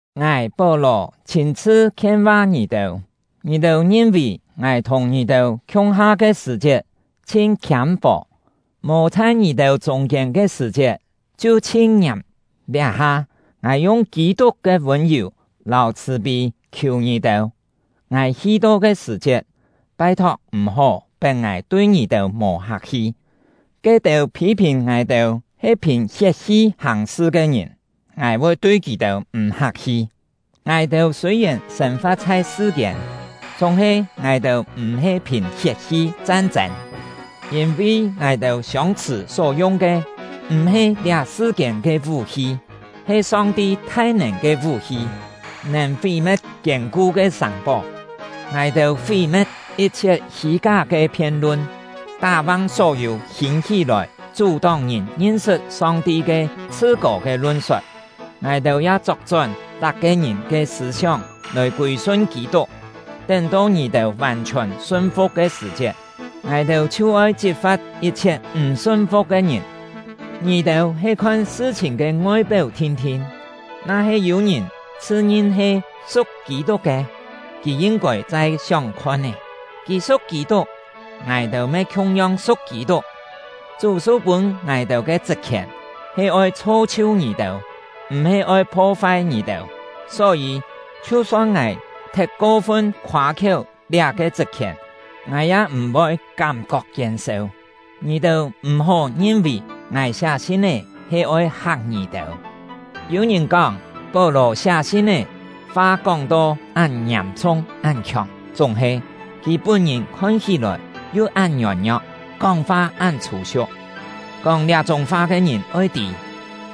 Ngài — Pó-lò chhîn-chhṳ khien-va ngì-têu. Ngì-têu ngin-vì ngài thùng ngì-têu khiung-ha ke sṳ̀-chiet chhin khiâm-fò, mò chhai ngì-têu chûng-kiên ke sṳ̀-chiet chhiu chhin ngiàm; liá-ha, ngài yung Kî-tuk ke vûn-yù lâu chhṳ̀-pî khiù ngì-têu: Ngài hi-to ke sṳ̀-chiet, pai-thok m̀-hó pet ngài tui ngì-têu mò hak-hi; ke-têu phî-phìn ngài-têu he phìn hiet-hi hàng-sṳ ke ngìn, ngài voi tui kì-têu m̀ hak-hi. Ngài-têu sûi-yèn sên-fa̍t chhai sṳ-kiên, chúng-he ngài-têu m̀-he phìn hiet-hi chan-chên. Yîn-vi ngài-têu siông-chhṳ̀ só yung ke m̀-he liá sṳ-kiên ke vú-hi, he Song-ti thai-nèn ke vú-hi, nèn fí-me̍t kiên-ku ke sàng-pó. Ngài-têu fí-me̍t yit-chhiet hî-ká ke phien-lun, tá-vang só-yû hîn-hí-lòi chú-tóng ngìn ngin-sṳt Song-ti ke chhṳ-kô ke lun-sot; ngài-têu ya chok-chón tak-ke ngìn ke sṳ̂-sióng lòi kûi-sun Kî-tuk. Tén-to ngì-têu vàn-chhiòn sun-fu̍k ke sṳ̀-chiet, ngài-têu chhiu oi chit-fa̍t yit-chhiet m̀ sun-fu̍k ke ngìn. Ngì-têu he khon sṳ-chhìn ke ngoi-péu thin-thin. Na-he yû ngìn chhṳ-ngin he su̍k Kî-tuk ke, kì yin-kôi chai sióng khon-é, kì su̍k Kî-tuk, ngài-têu me khiung-yong su̍k Kî-tuk. Chú su-pûn ngài-têu ke chṳt-khièn he oi chho-chhiu ngì-têu, m̀-he oi pho-fai ngì-têu. Só-yî, chhiu-son ngài thet ko-fun khoâ-khiéu liá-ke chṳt-khièn, ngài ya m̀-voi kám-kok kien-seu. Ngì-têu m̀-hó ngin-vì ngài siá sin-é he oi hak ngì-têu. Yû ngìn kóng: “Pó-lò siá sin-é, fa kóng-to án ngiàm-chhung án khiòng; chúng-he, kì pún-ngìn khon hí-lòi yu án ngiôn-ngio̍k, kóng-fa án chhû-siu̍k!” Kóng liá-chúng fa ke ngìn oi tî,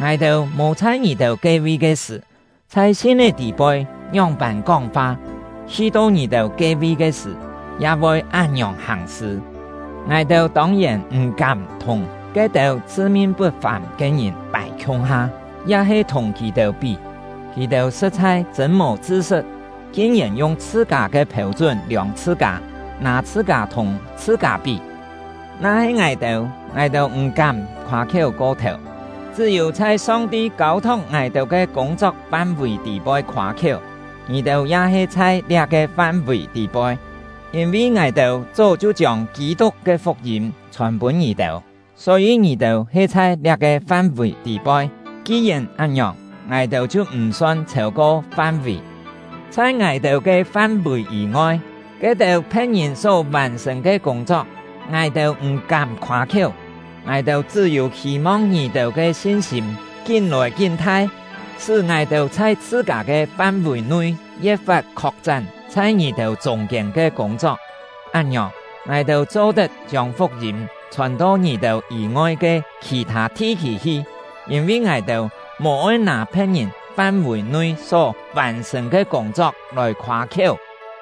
ngài-têu mò chhai ngì-têu ke-vi ke sṳ̀, chhai sin-é tî-poi ngióng-pân kóng-fa, hi-to ngì-têu ke-vi ke sṳ̀, ya voi án-ngiòng hàng-sṳ. Ngài-têu tông-yèn m̀-kám thùng ke-têu chhṳ-min put-fàm ke ngìn pài khiung-ha, ya-he thùng kì-têu pí. Kì-têu sṳ̍t-chhai chṳ̂n mò chṳ-sṳt, kin-yèn yung chhṳ-kâ ke phêu-chún liòng chhṳ-kâ, nâ chhṳ-kâ thùng chhṳ-kâ pí! Na-he ngài-têu, ngài-têu m̀-kám khoâ-khiéu ko-thèu, chṳ́-yû chhai Song-ti kâu-thok ngài-têu ke kûng-chok fam-vì tî-poi khoâ-khiéu; ngì-têu ya he chhai liá-ke fam-vì tî-poi. Yîn-vi ngài-têu chó chhiu chiông Kî-tuk ke fuk-yîm chhòn-pûn ngì-têu, só-yî ngì-têu he chhai liá-ke fam-vì tî-poi; ki-yèn án-ngiòng, ngài-têu chhiu m̀-son chhêu-ko fam-vì. Chhai ngài-têu ke fam-vì yî-ngoi, ke-têu phe̍t-ngìn só vàn-sṳ̀n ke kûng-chok, ngài-têu m̀-kám khoâ-khiéu. Ngài-têu chṳ́-yû hî-mong ngì-têu ke sin-sîm kín-lòi kín-thai, sṳ́ ngài-têu chhai chhṳ-kâ ke fam-vì-nui ye̍t-fat khok-chán chhai ngì-têu chûng-kiên ke kûng-chok; án-ngiòng, ngài-têu cho-tet chiông fuk-yîm chhòn to ngì-têu yî-ngoi ke khì-thâ thi-khî hi; yîn-vi ngài-têu mò-oi nâ phe̍t-ngìn fam-vì-nui só vàn-sṳ̀n ke kûng-chok lòi khoâ-khiéu.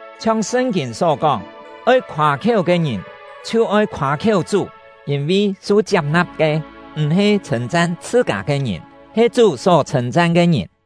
Chhiong Sṳn-kîn só kóng: “Oi khoâ-khiéu ke ngìn, chhiu oi khoâ-khiéu Chú!” Yîn-vi su chiap-na̍p ke, m̀-he chhṳ̂n-chan chhṳ-kâ ke ngìn, he Chú só chhṳ̂n-chan ke ngìn.